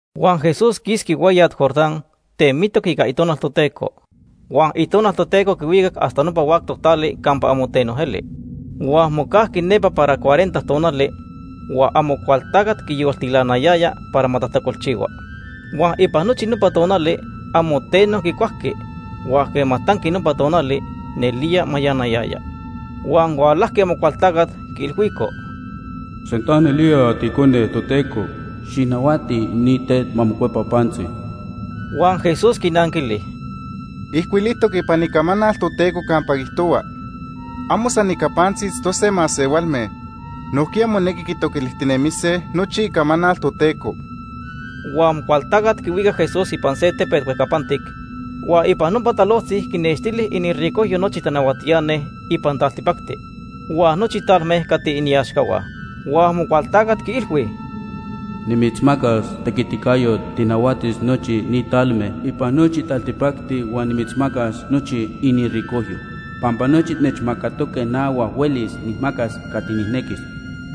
Huan Jesús quisqui hueyat Jordán temitoc ica Itonal Toteco. Huan Itonal Toteco quihuicac hasta nopa huactoc tali campa amo teno eli. Huan mocajqui nepa para cuarenta tonali huan Amocualtacat quiyoltilanayaya para ma tajtacolchihua. Huan ipan nochi nopa tonali amo teno quicuajqui, huan quema tanqui nopa tonali, nelía mayanayaya. Huan hualajqui Amocualtacat quiilhuico: ―Sinta nelía tiIcone Toteco, xijnahuati ni tet ma mocuepa pantzi. Huan Jesús quinanquili: ―Ijcuilijtoc ipan Icamanal Toteco campa quiijtohua: ‘Amo san ica pantzi itztose masehualme. Nojquiya monequi quitoquilijtinemise nochi Icamanal Toteco.’ Huan Amocualtacat quihuicac Jesús ipan se tepet huejcapantic, huan ipan nopa talojtzi quinextili iniricojyo nochi tanahuatiani ipan taltipacti, huan nochi talme cati iniaxcahua. Huan Amocualtacat quiilhui: ―Nimitzmacas tequiticayot tijnahuatis nochi ni talme ipan nochi taltipacti huan nimitzmacas nochi iniricojyo, pampa nochi nechmacatoque na huan huelis nijmacas cati nijnequis.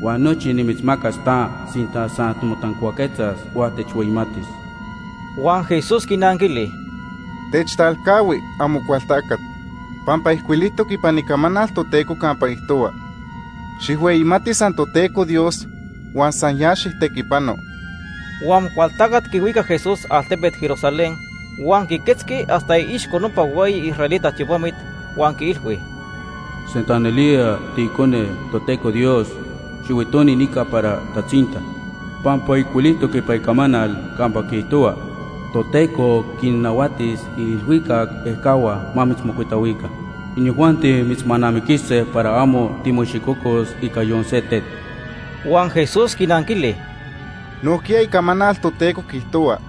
Huan nochi nimitzmacas ta sinta san timotancuaquetzas huan techhueyimatis. Huan Jesús quinanquili: ―Techtalcahui, Amocualtacat, pampa ijcuilijtoc ipan Icamanal Toteco campa quiijtohua: ‘Xijhueyimati san Toteco Dios huan san ya xijtequipano.’ Huan Amocualtacat quihuicac Jesús altepet Jerusalén, huan quiquetzqui hasta iixco nopa hueyi israelita tiopamit huan quiilhui: ―Sinta nelía tiIcone Toteco Dios, xihuitoni nica para tatzinta, pampa ijcuilijtoc ipan Icamanal campa quiijtohua: ‘Toteco quinnahuatis iilhuicac ejcahua ma mitzmocuitahuica. Inijuanti mitzmanamiquise para amo timoicxicocos ica yon se tet.’ Huan Jesús quinanquili: ―Nojquiya Icamanal Toteco quiijtohua: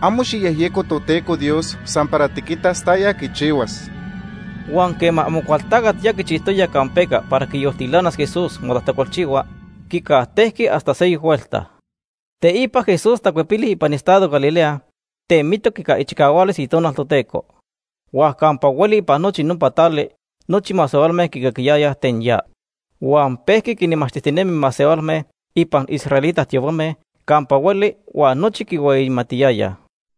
‘Amo xijyejyeco Toteco Dios san para tiquitas taya quichihuas.’ Huan quema Amocualtacat ya quichijtoya campeca para quiyoltilanas Jesús ma tajtacolchihua, quicajtejqui hasta seyoc huelta. Teipa Jesús tacuepili ipan estado Galilea temitoc ica ichicahualis Itonal Toteco, huan campa hueli ipan nochi nopa tali nochi masehualme quicaquiyayaj ten ya. Huan pejqui quinmachtijtinemi masehualme ipan israelita tiopame campa hueli huan nochi quihueyimatiyayaj.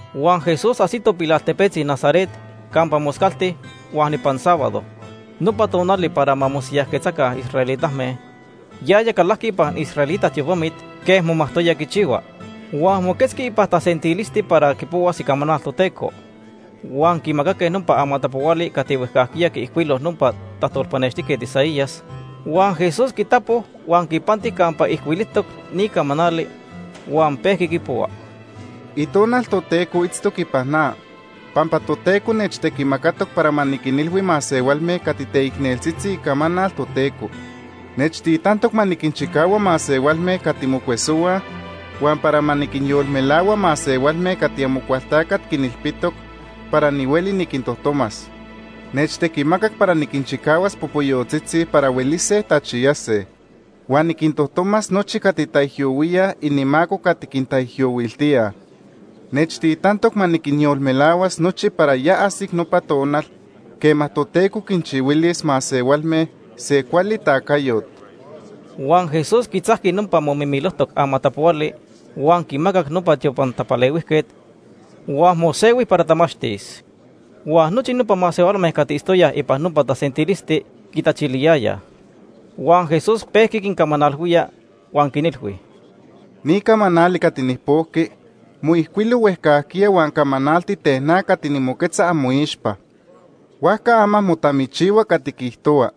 Huan Jesús ajsito pilaltepetzi Nazaret campa moscalti huan ipan sábado, nopa tonali para ma mosiyajquetzaca israelitame, yaya calajqui ipan israelita tiopamit quej momajtoya quichihua. Huan moquetzqui ipan tasentilisti para quipohuas Icamanal Toteco. Huan quimacaque nopa amatapohuali cati huejcajquiya quiijcuilo nopa tajtolpanextijquet Isaías. Huan Jesús quitapo huan quipanti campa ijcuilijtoc ni camanali, huan pejqui quipohua: “Itonal Toteco itztoc ipan na, pampa Toteco nechtequimacatoc para ma niquinilhui masehualme cati teicneltzitzi icamanal Toteco. Nechtitantoc ma niquinchicahua masehualme cati mocuesohuaj, huan para ma niquinyolmelahua masehualme cati Amocualtacat quinilpitoc para nihueli niquintojtomas. Nechtequimacac para niquinchicahuas popoyotzitzi para huelise tachiyase. Huan niquintojtomas nochi cati taijyohuíaj inimaco cati quintaijyohuiltíaj. Nechtitantoc ma niquinyolmelahuas nochi para ya ajsic nopa tonal, quema Toteco quinchihuilis masehualme se cuali tacayot.” Huan Jesús quitzajqui nopa momimilojtoc amatapohuali huan quimacac nopa tiopan tapalehuijquet, huan mosehui para tamachtis. Huan nochi nopa masehualme cati itztoyaj ipan nopa tasentilisti quitachiliyayaj. Huan Jesús pejqui quincamanalhuía huan quinilhui: ―Ni camanali cati nijpojqui moijcuilo huejcajquiya huan camanalti ten na cati nimoquetza amoixpa. Huajca ama motamichihua cati quiijtohua.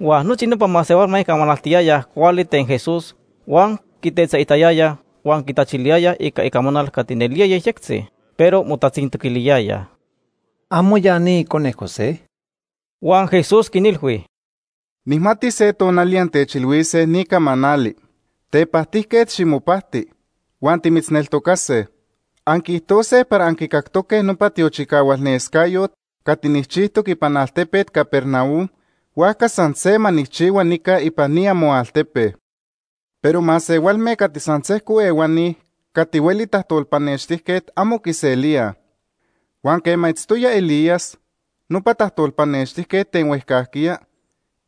Huan nochi nopa masehualme camanaltiyayaj cuali ten Jesús huan quitetzaitayayaj huan quitachiliyayaj ica icamanal cati nelía yejyectzi, pero motatzintoquiliyayaj: ―¿Amo ya ni icone José? Huan Jesús quinilhui: ―Nijmati se tonali antechilhuise ni camanali: ‘Tepajtijquet ximopajti, huan timitzneltocase.’ Anquiijtose para anquicactoque nopa tiochicahualnescayot cati nijchijtoc ipan altepet Capernaum, huajca san se ma nijchihua nica ipan ni amoaltepe. Pero masehualme cati san sejco ehuani cati hueli tajtolpanextijquet amo quiselíaj. Huan quema itztoya Elías, nopa tajtolpanextijquet ten huejcajquiya,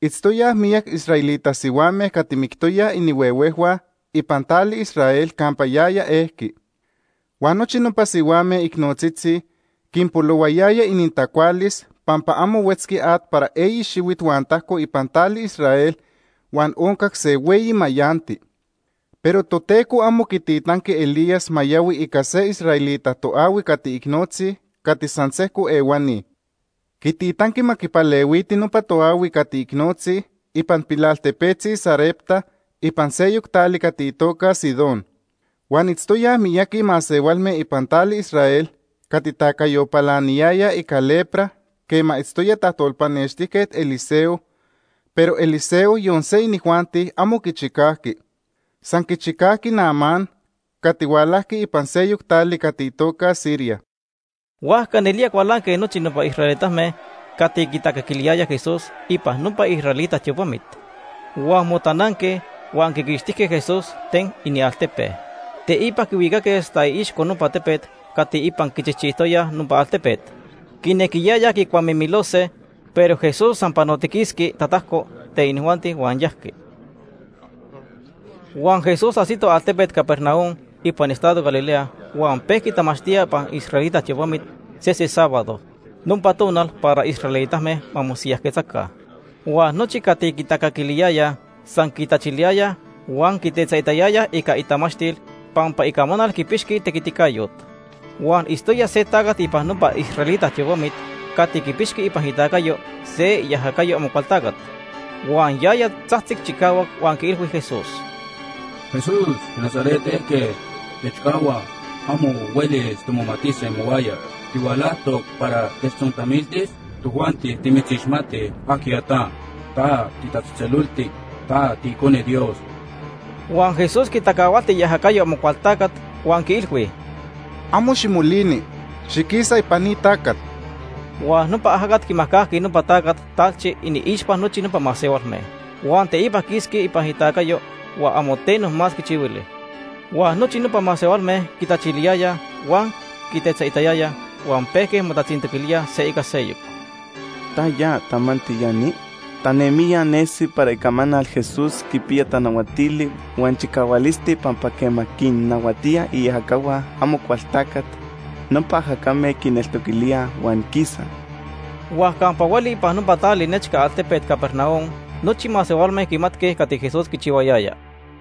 itztoyaj miyac israelita sihuame cati mictoyaj inihuehuejhua ipan tali Israel campa yaya ejqui. Huan nochi nopa sihuame icnotzitzi quinpolohuayaya inintacualis pampa amo huetzqui at para eyi xihuit huan tajco ipan tali Israel huan oncac se hueyi mayanti. Pero Toteco amo quititanqui Elías ma yahui ica se israelita toahui cati icnotzi cati san sejco ehuani. Quititanqui ma quipalehuiti nopa toahui cati icnotzi ipan pilaltepetzi Sarepta ipan seyoc tali cati itoca Sidón. Huan itztoyaj miyaqui masehualme ipan tali Israel cati tacayo palaniyayaj ica lepra quema itztoya tajtolpanextijquet Eliseo, pero Eliseo yon se inijuanti amo quichicajqui. San quichicajqui Naamán cati hualajqui ipan seyoc tali cati itoca Siria. Huajca nelía cualanque nochi nopa israelitame cati quitacaquiliyayaj Jesús ipan nopa israelita tiopamit. Huan motananque huan quiquixtijque Jesús ten inialtepe. Teipa quihuicaque hasta iixco nopa tepet cati ipan quichijchijtoyaj nopa altepet. Quinequiyayaj quicuamimilose, pero Jesús san panotiquisqui tatajco ten inijuanti huan yajqui. Huan Jesús ajsito altepet Capernaum ipan estado Galilea huan pejqui tamachtía ipan israelita tiopamit sese sábado, nopa tonal para israelitame ma mosiyajquetzaca. Huan nochi cati quitacaquiliyayaj san quitachiliyayaj huan quitetzaitayayaj ica itamachtil, pampa icamanal quipixqui tequiticayot. Huan itztoya se tacat ipan nopa israelita tiopamit cati quipixqui ipan itacayo se iajacayo Amocualtacat. Huan yaya tzajtzic chicahuac huan quiilhui Jesús: ―Jesús, tiNazaret ejquet, techcahua. Amo huelis timomatise mohuaya. ¿Tihualajtoc para techtzontamiltis? Tojuanti timitzixmatij ajquiya ta. Ta titatzejtzeloltic. Ta tiIcone Dios. Huan Jesús quitacahualti iajacayo Amocualtacat huan quiilhui: ―Amo ximolini. Xiquisa ipan ni tacat. Huan nopa ajacat quimajcajqui nopa tacat talchi iniixpa nochi nopa masehualme, huan teipa quisqui ipan itacayo huan amo teno más quichihuili. Huan nochi nopa masehualme quitachiliyayaj huan quitetzaitayayaj huan pejque motatzintoquilíaj se ica seyoc: ―¿Taya tamanti ya ni? Tanemijya nesi para icamanal Jesús quipiya tanahuatili huan chicahualisti pampa quema quinnahuatía iajacahua Amocualtacat, nopa ajacame quineltoquilíaj huan quisaj. Huan campa hueli ipan nopa tali nechca altepet Capernaum nochi masehualme quimatque cati Jesús quichihuayaya.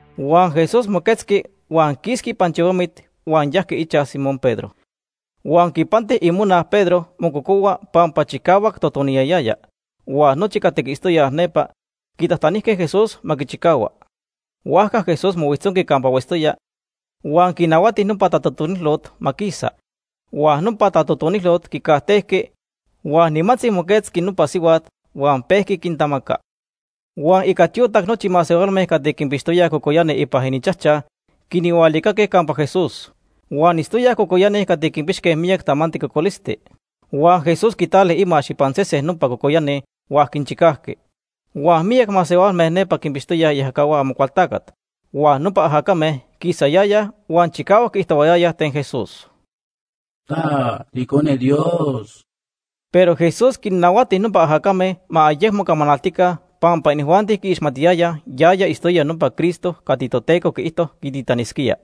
Huan Jesús moquetzqui huan quisqui ipan tiopamit huan yajqui ichaj Simón Pedro. Huan quipanti imona Pedro mococohua pampa chicahuac totoniyayaya, huan nochi cati itztoyaj nepa quitajtanijque Jesús ma quichicahua. Huajca Jesús mohuijtzonqui campa huetztoya huan quinahuati nopa tatotonilot ma quisa. Huan nopa tatotonilot quicajtejqui, huan nimantzi moquetzqui nopa sihuat huan pejqui quintamaca. Huan ica tiotac nochi masehualme cati quinpixtoyaj cocoyani ipan ininchajchaj quinhualicaque campa Jesús. Huan itztoyaj cocoyani cati quipixque miyac tamanti cocolisti. Huan Jesús quitali imax ipan sesen nopa cocoyani huan quinchicajqui. Huan miyac masehualme nepa quinpixtoyaj iajacahua Amocualtacat huan nopa ajacame quisayayaj huan chicahuac quiijtohuayayaj ten Jesús: ―Ta tiIcone Dios. Pero Jesús quinnahuati nopa ajacame ma ayecmo camanaltica pampa inijuanti quiixmatiyayaj yaya itztoya nopa Cristo cati Toteco quiijto quititanisquía.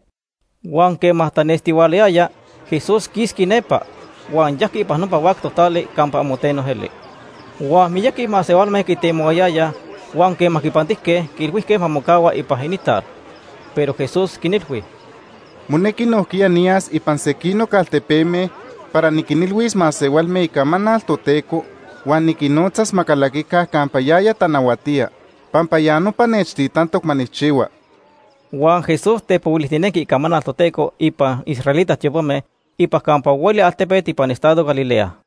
Huan quema tanestihualayaya, Jesús quisqui nepa, huan yajqui ipan nopa huactoc tali campa amo teno eli. Huan miyaqui masehualme quitemohuayayaj huan quema quipantijque, quiilhuijque ma mocahua ipan inintal. Pero Jesús quinilhui: ―Monequi nojquiya niyas ipan sequinoc altepeme para niquinilhuis masehualme icamanal Toteco huan niquinnotzas ma calaquica campa yaya tanahuatía, pampa ya nopa nechtitantoc ma nijchihua. Huan Jesús tepohuilijtinenqui icamanal Toteco ipan israelita tiopame ipan campa hueli altepet ipan estado Galilea.